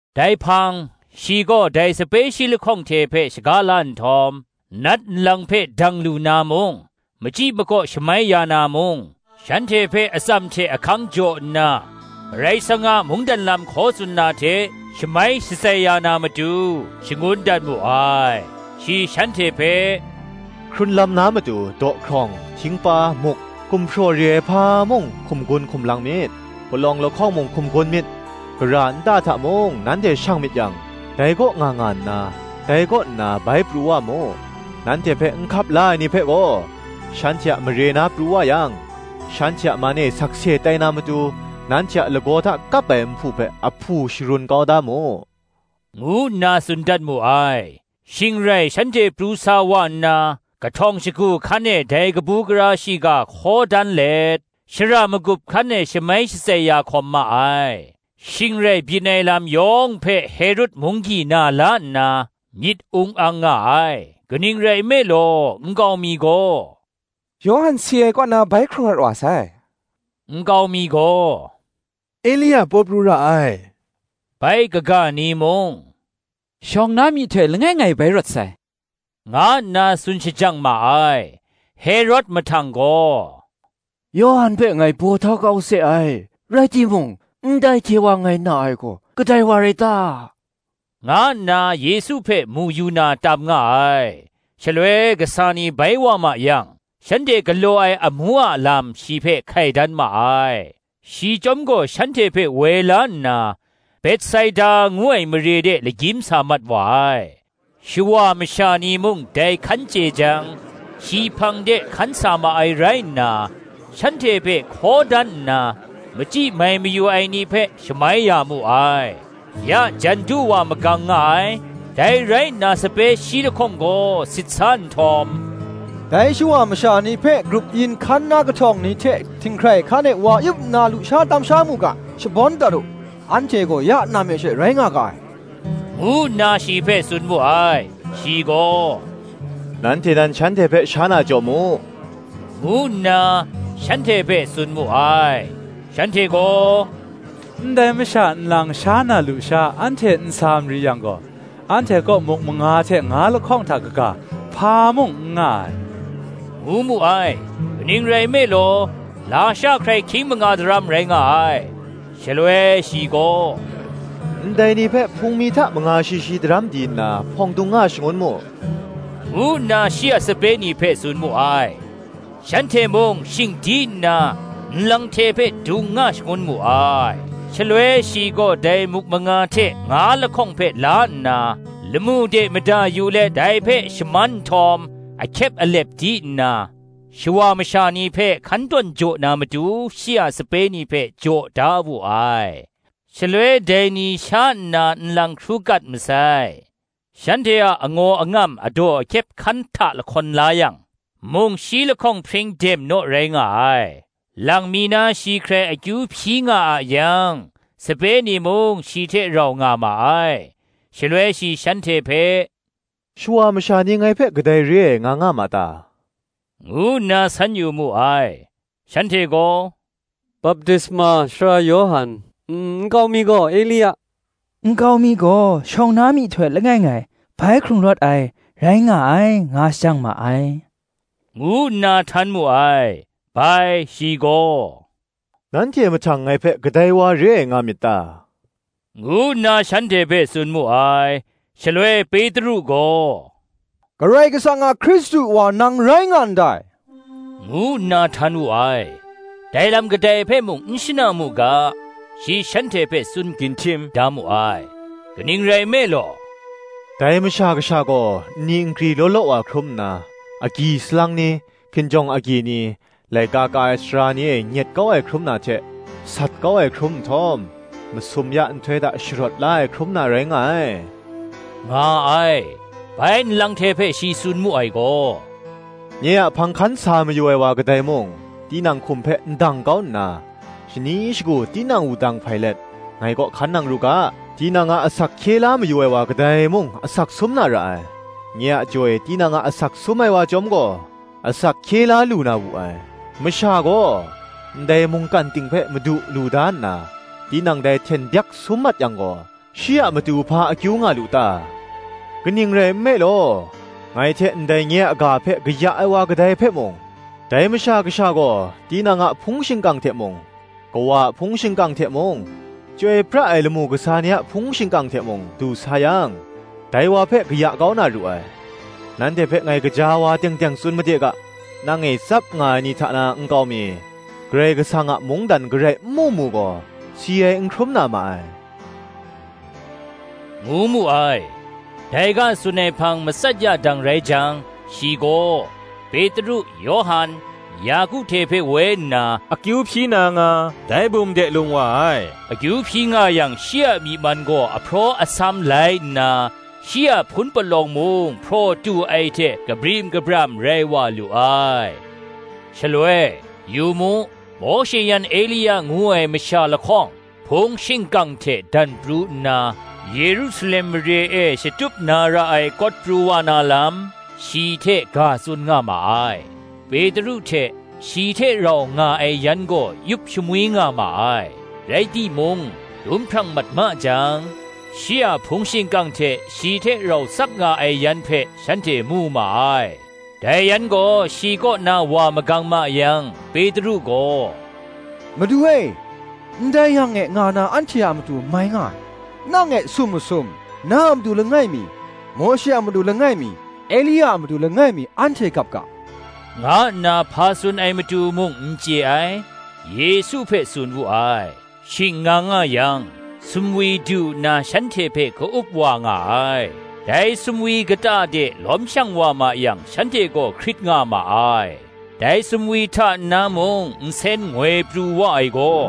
Dai hpang, shi gaw dai sape shi lahkawng hte hpe shaga la nhtawm, nat nlang hpe dang lu na mung, machyi makaw shamai ya na mung, shanhte hpe atsam hte ahkang jaw nna, Karai Kasang a mungdan lam hkaw tsun na hte, shamai shatsai ya na matu shangun dat mu ai. Shi shanhte hpe, “Hkrun lam na matu dawhkrawng, htingpa, muk, gumhpraw re ai hpa mung hkum gun hkum lang myit; palawng lahkawng mung hkum gun myit. Gara nta hta mung nanhte shang myit yang, dai kaw nga nga nna, dai kaw nna bai pru wa mu. Nanhte hpe n hkap la ai ni hpe gaw, shanhte a mare na pru wa yang, shanhte a man e sakse tai na matu, nanhte a lagaw hta kap ai nhpu hpe ahpu sharun kau da mu,” ngu nna tsun dat mu ai. Shing rai shanhte pru sa wa nna, kahtawng shagu hkan e dai kabu gara shiga hkaw dan let, shara magup hkan e shamai shatsai ya hkawm ma ai. Shing rai byin ai lam yawng hpe Herod munggyi na la nna, myit ung ang nga ai: kaning rai nme law, nkau mi gaw, Yawhan si ai kaw na bai hkrung rawt wa sai; nkau mi gaw, Elia paw pru ra ai; bai kaga ni mung, Shawng na myihtoi langai ngai bai rawt sai, nga nna tsun shajang ma ai. Herod mahtang gaw, Yawhan hpe ngai baw htau kau se ai; rai timung, ndai hte wa ngai na ai gaw, kadai wa rai ta?” nga nna, Yesu hpe mu yu na tam nga ai. Shaloi kasa ni bai wa ma yang, shanhte galaw ai amu a lam shi hpe hkai dan ma ai. Shi chyawm gaw shanhte hpe woi la nna, Betsaida ngu ai mare de lagyim sa mat wa ai. Shawa masha ni mung dai hkan chye jang, shi hpang de hkan sa ma ai rai nna, shanhte hpe hkaw dan nna, machyi mai mayu ai ni hpe shamai ya mu ai. Ya jan du wa magang nga ai: dai rai nna sape shi lahkawng gaw sit sa nhtawm, “Dai shawa masha ni hpe grup yin hkan na kahtawng ni hte htinghkrai hkan e wa yup nna lusha tam sha mu ga, shabawn dat u: anhte gaw ya nam e she rai nga ga ai,” ngu nna shi hpe tsun mu ai. Shi gaw, Nanhte nan shanhte hpe sha na jaw mu, ngu nna, shanhte hpe tsun mu ai. Shanhte gaw, Ndai masha nlang sha na lusha anhte n sa mari yang gaw, anhte kaw muk manga hte nga lahkawng hta kaga hpa mung n nga ai, ngu mu ai: kaning rai nme law, lasha hkrai hkying manga daram rai nga ai. Shaloi shi gaw, Ndai ni hpe hpung mi hta manga shi shi daram di nna, hpawng dung nga shangun mu, ngu nna shi a sape ni hpe tsun mu ai. Shanhte mung shing di nna, nlang hte hpe dung nga shangun mu ai. Shaloi shi gaw dai muk manga hte nga lahkawng hpe la nna, lamu de mada yu let dai hpe shaman nhtawm, ahkyep alep di nna, shawa masha ni hpe hkan tawn jaw na matu shi a sape ni hpe jaw da wu ai. Shaloi dai ni sha nna nlang hkru kat masai: shanhte a angaw angam adaw ahkyep hkan hta lahkawn la yang, mung shi lahkawng hpring dem naw rai nga ai. Lang mi na shi hkrai akyu hpyi nga a yang, sape ni mung shi hte rau nga ma ai: shaloi shi shanhte hpe, “Shawa masha ni ngai hpe kadai re ai nga nga ma ta?” ngu nna san yu ma ai. Shanhte gaw, Baptisma Sara Yawhan, nkau mi gaw, Elia, nkau mi gaw, shawng na myihtoi langai ngai bai hkrung rawt ai, rai nga ai, nga shajang ma ai,” ngu nna htan mu ai. Bai, Shi gaw, nanhte mahtang ngai hpe kadai wa re ai nga myit ta? ngu nna shanhte hpe tsun mu ai. Shaloi Petru gaw, Karai Kasang a Hkristu wa nang rai nga ndai, ngu nna htan wu ai. Dai lam kadai hpe mung n shana mu ga, shi shanhte hpe tsun ginhtim da mu ai. kaning rai nme law, “Dai Masha Kasha gaw nni nkri law law wa hkrum nna, agyi salang ni, hkinjawng agyi ni, laika ka ai sara ni e nyet kau ai hkrum na hte sat kau ai hkrum nhtawm, masum ya nhtoi hta sharawt la ai hkrum na rai nga ai,” nga ai. Bai nlang hte hpe shi tsun mu ai gaw, “Nye a hpang hkan sa mayu ai wa kadai mung, tinang hkum hpe ndang kau nna, shani shagu tinang wudang hpai let, ngai kaw hkan nang ru ga. Tinang a asak hkye la mayu ai wa kadai mung asak sum na ra ai; nye a jaw e tinang a asak sum ai wa chyawm gaw, asak hkye la lu na wu ai. Masha gaw, ndai mungkan ting hpe madu lu da nna, tinang dai hten byak sum mat yang gaw, shi a matu hpa akyu nga lu ta? kaning rai nme law, ngai hte ndai nye a ga hpe kaya ai wa kadai hpe mung, dai Masha Kasha gaw tinang a hpung shingkang hte mung, Kawa a hpung shingkang hte mung, chyoi pra ai lamu kasa ni a hpung shingkang hte mung du sa yang, dai wa hpe kaya kau na ru ai. Nanhte hpe ngai gaja wa teng teng tsun made ga, Nang e tsap nga ai ni hta na nkau mi, Karai Kasang a mungdan garai n mu mu gaw, si ai n hkrum na ma ai,” ngu mu ai. Dai ga tsun ai hpang matsat ya dang rai jang, shi gaw, Petru, Yawhan, Yaku hte hpe woi nna, akyu hpyi na nga, dai bum de lung wa ai. Akyu hpyi nga yang shi a myi man gaw ahpraw asam lai nna, shi a hpun palawng mung hpraw tu ai hte kabrim kabram rai wa lu ai. Shaloi, yu mu, Mawshe yan Elia ngu ai masha lahkawng, hpung shingkang hte dan pru nna, Yerusalem mare e shatup na ra ai kawt pru wa na lam, shi hte ga tsun nga ma ai. Petru hte shi hte rau nga ai yan gaw yup shamwi nga ma ai: rai timung, dum hprang mat ma jang, shi a hpung shingkang hte shi hte rau tsap nga ai yan hpe shanhte mu ma ai. Dai yan gaw shi kaw na wa magang ma yang, Petru gaw, Madu e, ndai yang e nga na anhte a matu mai nga ai; nang e sum masum, na a matu langai mi, Mawshe a matu langai mi, Elia a matu langai mi anhte gap ga, nga nna hpa tsun ai matu mung n chye ai, Yesu hpe tsun wu ai. Shing nga nga yang, sumwi du nna shanhte hpe ka-up wa nga ai: dai sumwi kata de lawm shang wa ma yang shanhte gaw hkrit nga ma ai. Dai sumwi hta nna mung nsen ngoi pru wa ai gaw,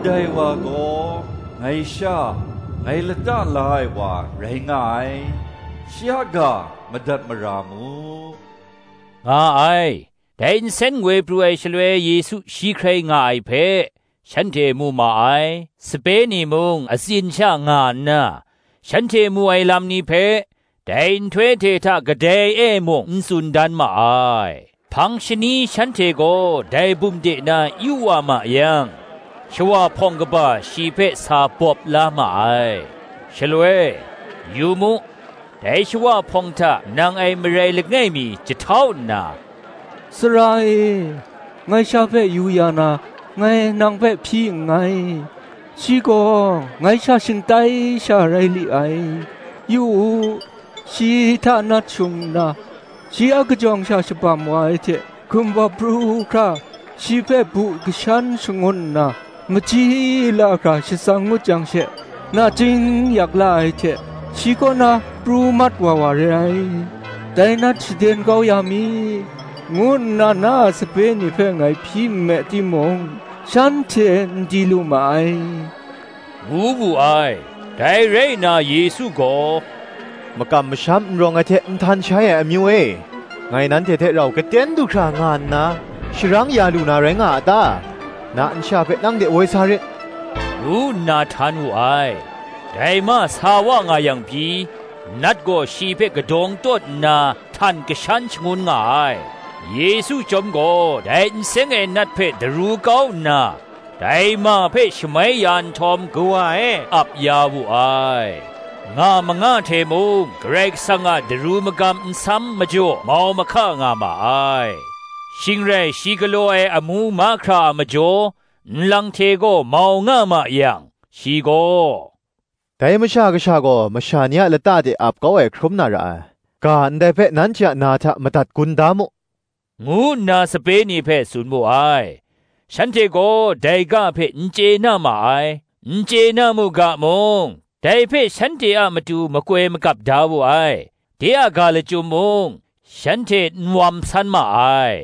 Ndai wa gaw, ngai Sha, ngai lata la ai wa rai nga ai: shi a ga madat mara mu, nga ai. Dai nsen ngoi pru ai shaloi Yesu shi hkrai nga ai hpe, shanhte mu ma ai: sape ni mung atsin sha nga nna, shanhte mu ai lam ni hpe, dai nhtoi hte hta kadai e mung n tsun dan ma ai. Hpang shani shanhte gaw dai bum de na yu wa ma yang, shawa hpawng kaba shi hpe sa bawp la ma ai. Shaloi, yu mu, dai shawa hpawng hta nang ai marai langai mi jahtau nna, “Sara e, ngai sha hpe yu ya na, ngai nang hpe hpyi nngai; shi gaw ngai sha shingtai sha rai li ai: yu u, shi hta nat shung nna, shi akajawng sha shabam wa ai hte, hkumbawp pru hkra shi hpe bu kashan shangun nna, machyi la hkra shatsang ngut jang she nachying yak la ai hte shi kaw na pru mat wa wa re ai. Dai nat shaden kau ya mi, ngu nna na a sape ni hpe ngai hpyi nme timung, shanhte n di lu ma ai,” ngu wu ai. Dai rai nna Yesu gaw, “Makam masham n rawng ai hte nhtan shai ai amyu e, ngai nanhte hte rau gaten du hkra nga nna, sharang ya lu na rai nga a ta? na nsha hpe nang de woi sa rit,” ngu nna htan wu ai. Dai ma sa wa nga yang pyi, nat gaw shi hpe kadawng tawn nna htan kashan shangun nga ai: Yesu chyawm gaw dai n seng ai nat hpe daru kau nna, dai ma hpe shamai ya nhtawm kawa e ap ya wu ai. Nga manga hte mung Karai Kasang a daru magam nsam majaw mau mahka nga ma ai. Shing rai shi galaw ai amu mahkra a majaw, nlang hte gaw mau nga ma yang, shi gaw, “Dai Masha Kasha gaw masha ni a lata de ap kau ai hkrum na ra ai, ga ndai hpe nanhte a na hta madat gun da mu,” ngu nna sape ni hpe tsun mu ai. Shanhte gaw dai ga hpe n chye na ma ai; n chye na mu ga mung, dai hpe shanhte a matu makoi magap da wu ai: de a ga lachyum mung, shanhte n wam san ma ai.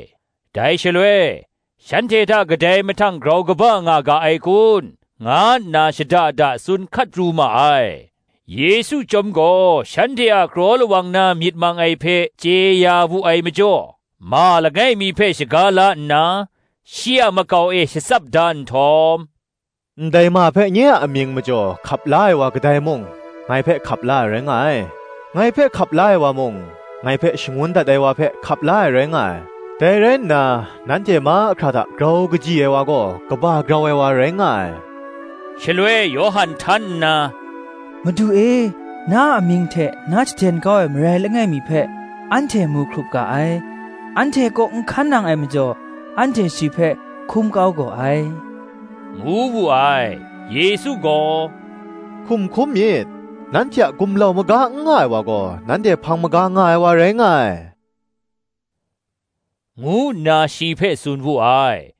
Dai shaloi, shanhte hta kadai mahtang grau kaba nga ga ai kun? nga nna shada da tsun hkat pru ma ai. Yesu chyawm gaw shanhte a kraw lawang na myit mang ai hpe chye ya wu ai majaw, ma langai mi hpe shaga la nna, shi a makau e shatsap da nhtawm, “Ndai ma hpe nye a amying majaw, hkap la ai wa kadai mung, ngai hpe hkap la ai rai nga ai; ngai hpe hkap la ai wa mung, ngai hpe shangun dat ai wa hpe hkap la ai rai nga ai: dai rai nna, nanhte mahkra hta grau kaji ai wa gaw kaba grau ai wa rai nga ai. Shaloi Yawhan htan nna, Madu e, na amying hte nat shaden kau ai marai langai mi hpe anhte mu hkrup ga ai; anhte kaw n hkan nang ai majaw, anhte shi hpe hkum kau gaw ai,” ngu wu ai. Yesu gaw, “Hkum hkum myit; nanhte a gumlau maga n nga ai wa gaw, nanhte hpang maga nga ai wa rai nga ai,” ngu nna shi hpe tsun wu ai.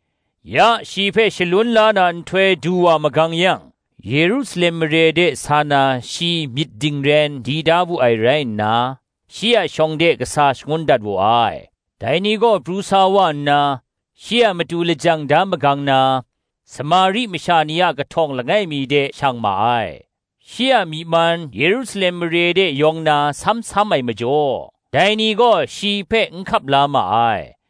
Ya shi hpe shalun la na nhtoi du wa magang yang, Yerusalem mare de sa na shi myit dingren di da wu ai rai nna, shi a shawng de kasa shangun dat wu ai. Dai ni gaw pru sa wa nna, shi a matu lajang da magang na, Samari masha ni a kahtawng langai mi de shang ma ai. Shi a myi man Yerusalem mare de yawng na sam sam ai majaw, dai ni gaw shi hpe n hkap la ma ai.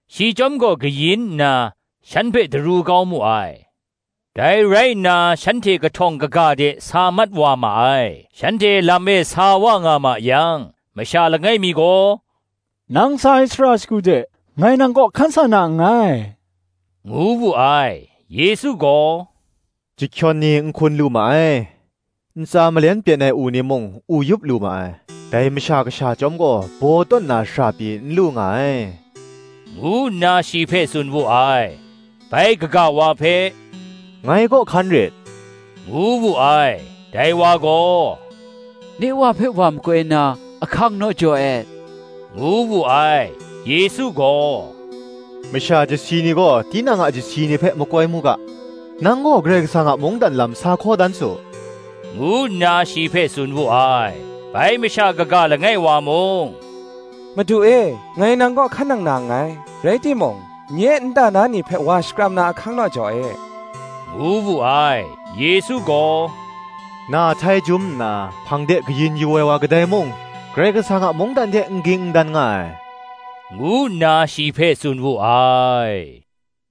Shi chyawm gaw kayin nna, shan hpe daru kau mu ai. Dai rai nna shanhte kahtawng kaga de sa mat wa ma ai. Shanhte lam e sa wa nga ma yang, masha langai mi gaw, “Nang sa ai shara shagu de, ngai nang kaw hkan sa na nngai,” ngu wu ai. Yesu gaw, “Chyahkyawn ni nhkun lu ma ai, ntsa malen pyen ai u ni mung, u yup lu ma ai; dai Masha Kasha chyawm gaw baw tawn na shara pyi n lu nga ai,” ngu nna shi hpe tsun wu ai. Bai kaga wa hpe, “Ngai kaw hkan rit,” ngu wu ai. Dai wa gaw, “Nye wa hpe wa makoi na ahkang naw jaw e,” ngu wu ai. Yesu gaw, “Masha chyasi ni gaw tinang a chyasi ni hpe makoi mu ga: nang gaw Karai Kasang a mungdan lam sa hkaw dan su,” ngu nna shi hpe tsun wu ai. Bai masha kaga langai wa mung, “Madu e, ngai nang kaw hkan nang na nngai; rai timung, nye nta na ni hpe wa shakram na ahkang naw jaw e,” ngu wu ai. Yesu gaw, “Na htai jum nna hpang de kayin yu ai wa kadai mung, Karai Kasang a mungdan hte n ging n dan nga ai,” ngu nna shi hpe tsun wu ai.